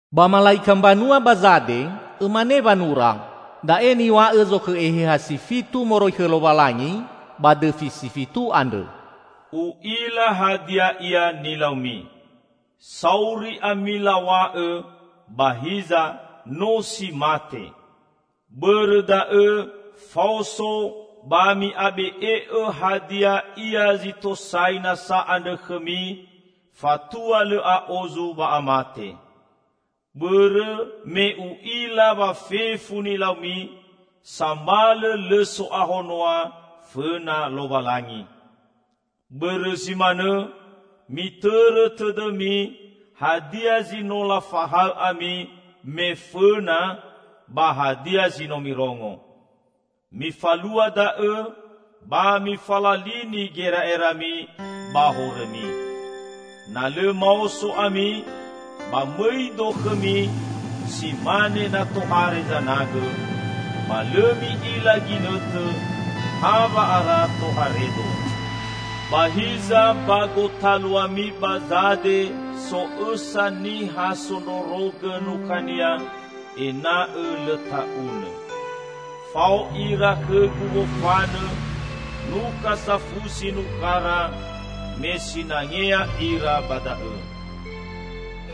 "Ba mala'ika mbanua ba Zade, õmane wanura: Da'e niw̃a'õ zokhõ eheha si fitu moroi khõ Lowalangi ba dõfi si fitu andrõ. U'ila hadia ia nilaumi. Sauri ami law̃a'õ, ba hiza no si mate! Bõrõ da'õ, faoso, ba mi'abe'e'õ hadia ia zi tosai nasa andrõ khõmi fatua lõ a'ozu wa'amate. Bõrõ me U'ila wa fefu nilaumi, sambalõ lõ so'ahonoa fõna Lowalangi. Bõrõ zi manõ mitõrõ tõdõmi hadia zi no lafahaõ ami me fõna ba hadia zi no mirongo. Mifalua da'õ ba mifalalini gera'erami ba horõmi. Na lõ maoso ami, ba mõi-Do khõmi si mane na tohare zanagõ; ba lõ mi'ila ginõtõ hawa'ara tohare-Do. Ba hiza ba gotaluami ba Zade so õsa niha sondrorogõ nukhania ena'õ lõ ta'unõ. Fao ira khõ-Gu wofanõ, nukha safusi nukhara, me sinangea ira ba da'õ.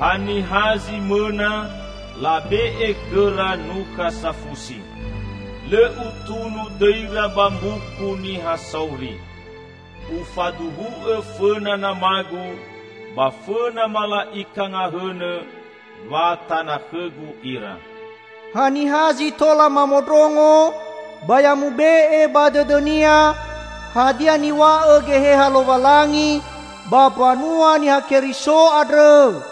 Haniha zi mõna, labe'e khõra nukha safusi. Lõ Utunu dõira ba Mbuku Niha Sauri. Ufaduhu'õ fõna Nama-Gu ba fõna mala'ika ngahõnõ wa tana khõ-Gu ira. Haniha zi tola mamondrongo, ba ya mube'e ba dõdõnia hadia niw̃a'õ Geheha Lowalangi ba mbanua Niha Keriso andrõ!"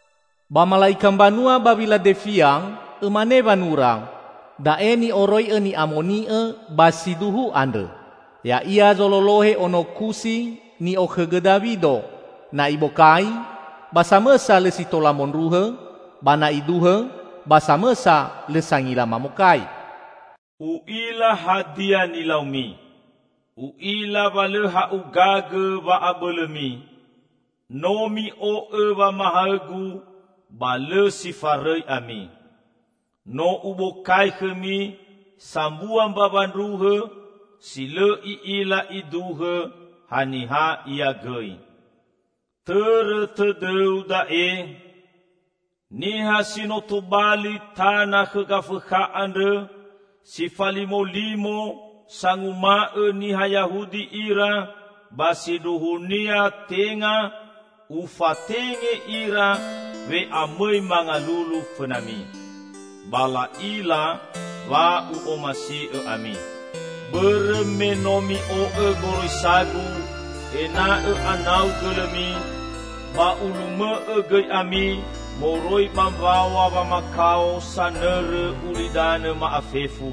"Ba mala'ika mbanua ba Wiladefia, õmane wanura: Da'e ni'oroi'õ Ni'amoni'õ ba si duhu andrõ. Ya'ia zololohe ono kusi ni'okhõgõ Dawido; na Ibokai, ba samõsa lõ si tola mondruhõ, ba na Iduhõ, ba samõsa lõ sangila mamokai. U'ila hadia nilaumi. U'ila wa lõ ha'ugagõ wa'abõlõmi; no mi'o'õ wamahaõ-Gu ba lõ si farõi ami. No Ubokai khõmi sambua mbawa ndruhõ, si lõ i'ila iduhõ haniha ia gõi. Tõrõ tõdõu da'e: Niha si no tobali tana khõ Gafõkha andrõ, si falimolimo, sanguma'õ niha Yahudi ira, ba sindruhunia tenga, Ufatenge ira we'amõi mangalulu fõnami. Ba la'ila wa U'omasi'õ ami. Bõrõ me no mi'o'õ goroisa-Gu ena'õ anau gõlõmi, ba Ulumõ'õ gõi ami moroi ba mbawa wamakao sanõrõ ulidanõ ma'afefu.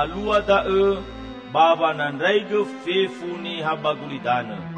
Alua da'õ, ba wanandraigõ fefu niha ba gulidanõ.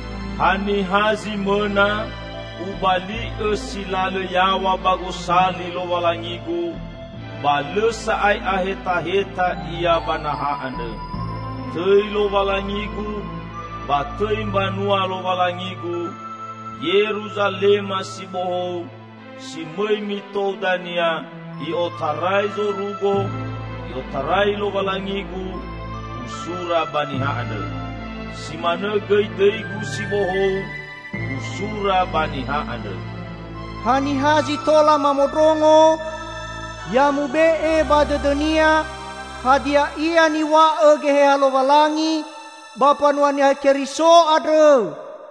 Haniha zi mõna, Ubali'õ si lalõ yaw̃a ba Gosali Lowalangi-Gu, ba lõ sa'ae ahetaheta ia ba naha andrõ. Tõi Lowalangi-Gu, ba tõi mbanua Lowalangi-Gu -- Yeruzalema si bohou si mõi mitou dania i'otarai zorugo, i'otarai Lowalangi-Gu -- Usura ba niha andrõ. Si manõ gõi dõi-Gu si bohou Usura ba niha andrõ. Haniha zi tola mamondrongo, ya mube'e ba dõdõnia hadia ia niw̃a'õ Geheha Lowalangi ba mbanua Niha Keriso andrõ!"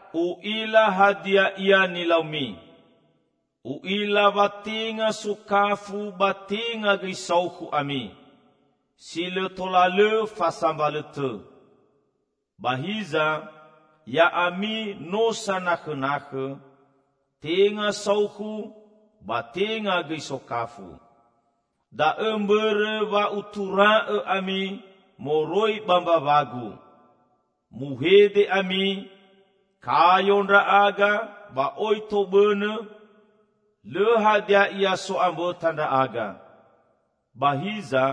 U'ila hadia ia nilaumi; U'ila wa tenga sokafu ba tenga gõi saukhu ami. Si lõ tola lõ fa sambalõtõ! Ba hiza! Ya'ami no sanakhõnakhõ; tenga saukhu, ba tenga gõi sokafu. Da'õ mbõrõ wa Utura'õ ami moroi ba mbawa-Gu. Muhede ami, 'Kayo ndra'aga ba oi tobõnõ; lõ hadia ia so'ambõta ndra'aga.' Ba hiza,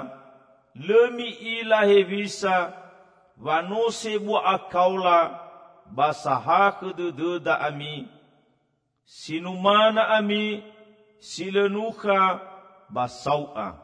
lõ mi'ila hewisa wa no sebua akaola ba sahakhõ dõdõda ami! Si numana ami, si lõ nukha, ba sau'a.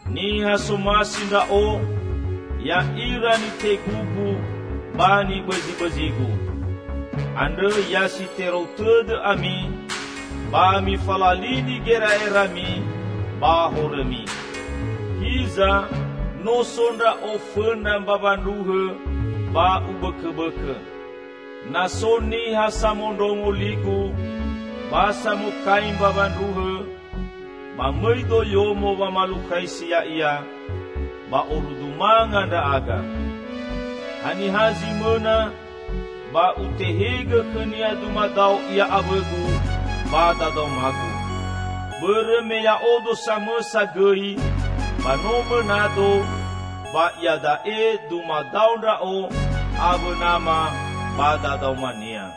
Niha somasi Ndra'o, ya'ira nitegu-Gu ba nibõzibõzi-Gu. Andrõ ya si terou tõdõ ami, ba mifalalini gera'erami ba horõmi. Hiza! No so Ndra'o fõna mbawa ndruhõ ba Ubõkõbõkõ. Na so niha samondrongo li-Gu, ba samokai mbawa ndruhõ, ba mõi-Do yomo wamalukhaisi ya'ia; ba orudu manga ndra'aga. Haniha zi mõna, ba Utehegõ khõnia dumadao ia awõ-Gu ba dadaoma-Gu. Bõrõ me Ya'odo samõsa gõi ba no mõna-Do, ba iada'e dumadao Ndra'o awõ Nama ba dadaoma-Nia.